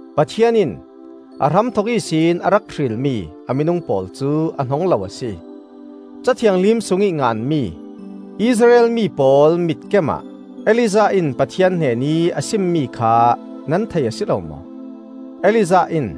Pathian in a hramthok ihsin a rak hrilmi a minung pawl cu a hnong lo a si. Ca Thianghlim sungih nganmi, Israel mi pawl mitkem ah Elijah in Pathian hnenih a simmi kha nan thei a si lo maw? Elijah in,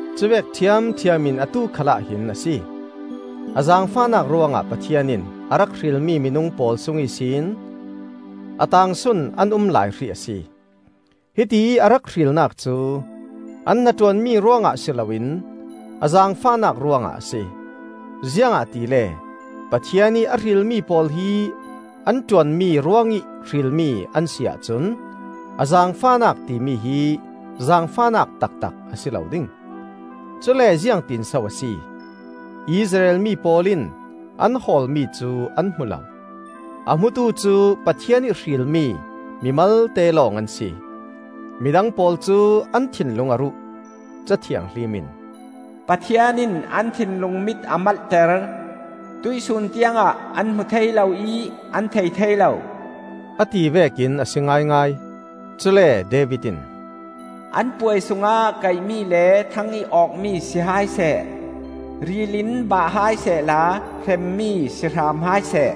Cuvek ṭhiamṭhiam in atu khalah hin a si - a zaangfahnak ruangah Pathian in a rak hrilmi minung pawl sung ihsin a taangsun an um lai hrih a si. Hitiih a rak hrilnak cu an hnaṭuanmi ruangah si loin a zaangfahnak ruangah a si. Ziangahtile Pathian ih a hrilmi pawl hi an ṭuanmi ruangih hrilmi an si ahcun a zaangfahnak timi hi zaangfahnak taktak a si lo ding. Cule ziangtinso a si? Israel mi pawl in an hawlmi cu an hmu lo. A hmutu cu Pathian ih hrilmi mi malte lawng an si. Midang pawl cu an thinlung a ruh. Ca Thianghlim in, “Pathian in an thinlung mit a malhter, Tuihsun tiangah an hmu thei lo ih an thei thei lo,” a ti vekin a si ngaingai. Cule David in, “An puai sungah kaihmi le thangih awkmi si hai seh; Ril in bah hai sehla hremmi si hram hai seh.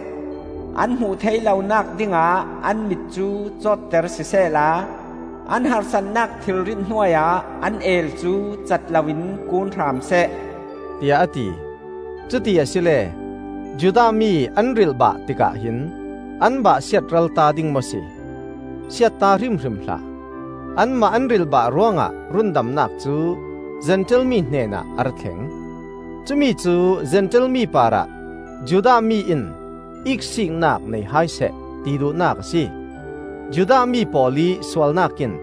An hmuh thei lonak dingah an mit cu cawtter sisehla, An harsatnak thilrit hnuai ah, an eel cu cat loin kun hram seh,” tiah a ti. Cuti asile Judah mi an rilhbah tikah hin an bah siatralta ding maw si? Siatta hrimhrim hlah! Anmah an rilhbah ruangah rundamnak cu Zentail mi hnenah a ra thleng. Cumi cu Zentail mi parah Judah mi in iksiknak nei hai seh, ti duhnak a si. Judah mi pawl ih sualnak in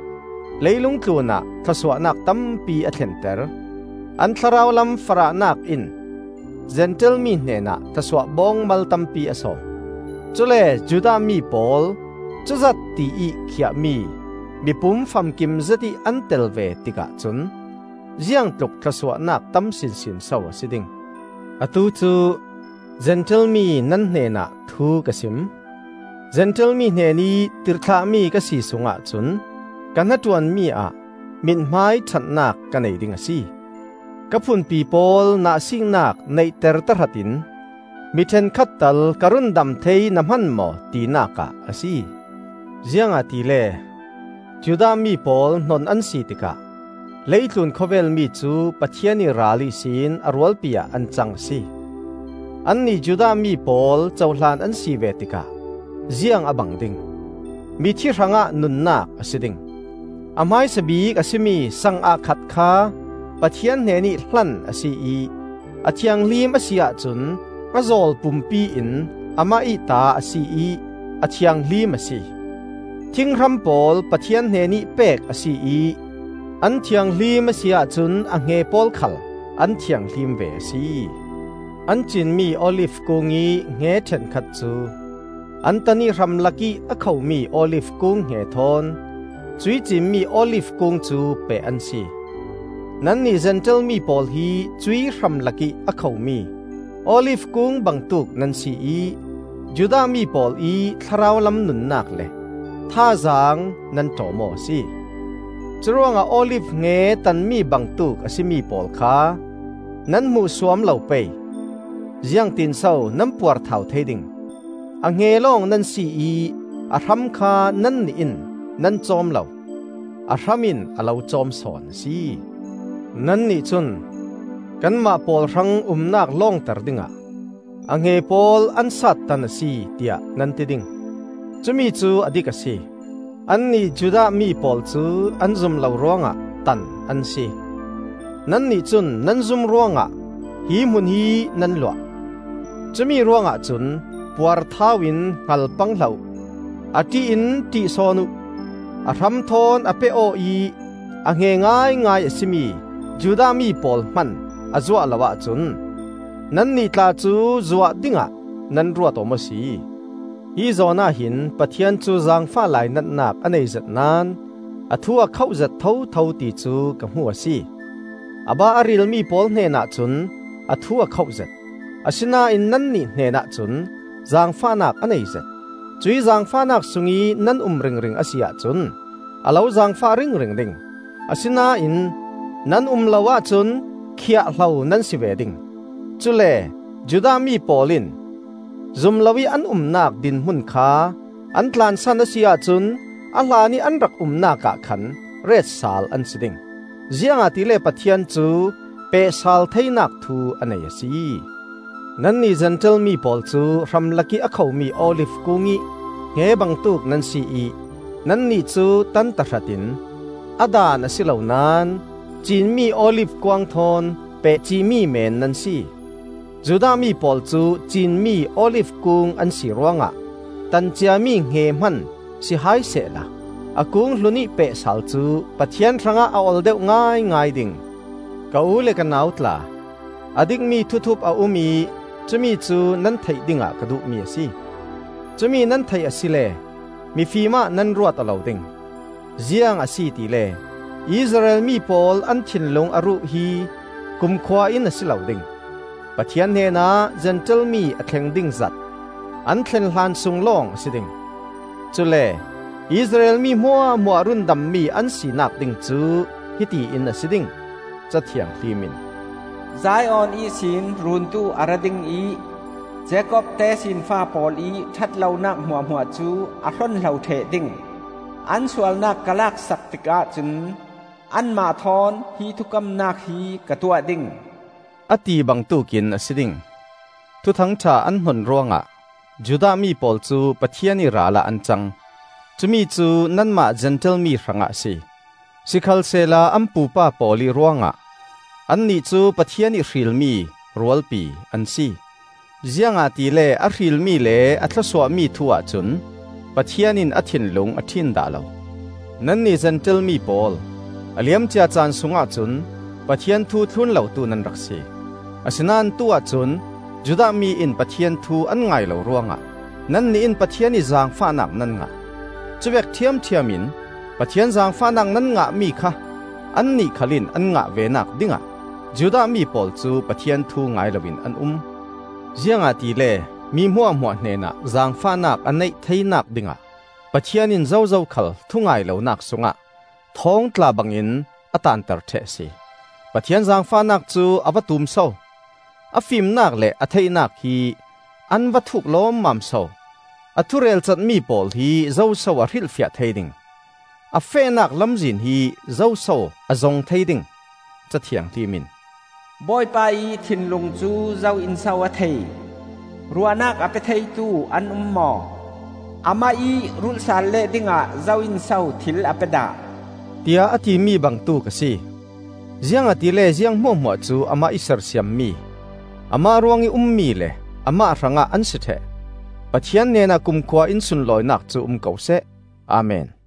leilung tlunah thlawsuahnak tampi a thlenter; an thlarau lam farahnak in Zentail mi hnenah thlawsuah bawngmal tampi a sawm. Cule Judah mi pawl cuzat tiih khiah mi mipum famkim zetih an tel ve tikah cun ziangtluk thlawsuahnak tam sinsin so a si ding! Atu cu Zentail mi nan hnenah thu ka sim: Zentail mi hnenih tirhthlahmi ka si sungah cun ka hnaṭuanmi ah mithmai ṭhatnak ka nei ding a si. Ka phunpi pawl nahsiiknak neihter tahratin mi ṭhenkhat tal ka rundam thei na hman maw tinak ah a si. Ziangahtile Judah mi pawl hnon an si tikah leitlun khawvel mi cu Pathian ih ral ihsin a rualpi ah an cang a si. Annih Judah mi pawl cohlan an si ve tikah ziang a bang ding? Mithi hrangah nunnak a si ding! A hmaisa bik a si mi sang ah khat kha Pathian hnenih hlan a si ih a thianghlim a si ahcun a zawl pumpi in amah ih ta a si ih a thianghlim a si. Thinghram pawl Pathian hnenih pek a si ih an thianghlim a si ahcun a hnge pawl khal an thianghlim ve a si. An cin mi olif kungih hnge ṭhenkhat cu an tan ih hramlakih a kho mi olif kung hnge thawn cuih cinmi olif kung cu peh an si. Nannih Zentail mi pawl hi cuih hramlakih a khomi olif kung bangtuk nan si ih Judah mi pawl ih thlarau lam nunnak le thazaang nan ṭawm aw a si. Curuangah olif hnge tanmi bangtuk a si mi pawl kha nan hmuhsuam lo pei. Ziangtin so nan puarthau thei ding? A hnge lawng nan si ih a hram kha nannih in nan cawm lo; a hram in a lo cawm sawn a si. Nannih cun, “Kanmah pawl hrang umnak lawngter dingah a hnge pawl an sattan a si,” tiah nan ti ding. Cumi cu a dik a si. Annih Judah mi pawl cu an zum lo ruangah tan an si; nannih cun nan zum ruangah hi hmun hi nan luah. Cumi ruangah cun puarthau in hngal pang hlah uh! A ṭih in ṭih sawn uh. A hram thawn a peh-aw ih a hnge ngaingai a si mi Judah mi pawl hman a zuah lo ahcun, nannih tla cu zuah dingah nan ruat aw maw si? Hi zawn ah hin Pathian cu zaangfah lainatnak a neizet naón a thu a khoh zet thotho ti cu ka hmu a si. A bah a rilmi pawl hnenah cun a thu a khoh zet, asinain nannih hnenah cun zaangfahnak a neizet. Cuih zaangfahnak sungih nan um ringring a si ahcun a lo zaangfah ringring ding; asinain nan um lo ahcun khiah-hlo nan si ve ding. Cule Judah mi pawl in zum loih an umnak dinhmun kha an tlansan a si ahcun a hlanih an rak umnak ah khan ret sal an si ding, ziangahtile Pathian cu pehsal theinak thu a nei a si. Nannih Zentail mi pawl cu hramlakih a khomi olif kungih hnge bangtuk nan si ih nannih cu tan tahratin, a daan a si lo naón, ciin-mi olif kuang thawn peh cihmi men nan si. Judah mi pawl cu cin-mi olif kung an si ruangah tan ciami hnge hman si hai sehla a kung hlunih peh sal cu Pathian hrangah a ol deuh ngaingai ding. Ka u le ka nau tla, a dikmi thuthup a um ih cumi cu nan theih dingah ka duhmi a si. Cumi nan theih asile mifim ah nan ruat aw lo ding. Ziang a si tile, Israel mi pawl an thinlung a ruh hi kumkhua in a si lo ding; Pathian hnenah Zentail mi a thleng ding zat an thlen hlan sung lawng a si ding. Cule Israel mi hmuahhmuah rundammi an sinak ding cu hiti in a si ding. Ca Thianghlim in, “Zion ihsin Runtu a ra ding ih Jakob tesinfa pawl ih ṭhatlonak hmuahhmuah cu a hlonhlo ṭheh ding. An sualnak ka laksak tikah cun, anmah thawn hi thukamnak hi ka tuah ding,” a ti bangtuk in a si ding. Thuthang ṭha an hnon ruangah Judah mi pawl cu Pathian ih ral ah an cang; cumi cu nanmah Zentail mi hrangah a si. Sikhalsehla an pupa pawl ih ruangah annih cu Pathian ih hrilmi rualpi an si. Ziangahtile a hrilmi le a thlawsuahmi thu-ah cun Pathian in a thinlung a ṭhin dah lo. Nannih Zentail mi pawl, a liam cia caan sungah cun Pathian thu thlun lotu nan rak si; asinain atu-ah cun Judah mi in Pathian thu an ngai lo ruangah nannih in Pathian ih zaangfahnak nan ngah. Cuvek ṭhiamṭhiam in Pathian zaangfahnak nan ngahmi kha annih khal in an ngah venak dingah Judah mi pawl cu Pathian thu ngai loin an um. Ziangahtile, mi hmuahhmuah hnenah zaangfahnak a neih theinak dingah Pathian in zozo khal thu-ngai lonak sungah thawngtla bangin a taanter ṭheh a si. Pathian zaangfahnak cu a va tum so! A fimnak le a theihnak hi an va thuk lawmmam so! A thu relcatmi pawl hi zoso a hrilhfiah thei ding? A fehnak lamzin hi zoso a zong thei ding? Ca Thianghlim in, “Bawipa ih thinlung cu zo in so a thei? Ruahnak a pe theitu an um maw? Amah ih rulh sal leh dingah zo in so thil a pe dah?” tiah a timi bangtuk a si. Ziangahtile ziang hmuahhmuah cu Amah ih sersiammi, Amah ruangih ummi le Amah hrangah an si ṭheh. Pathian hnenah kumkhua-in sunlawinak cu um ko seh! Amen.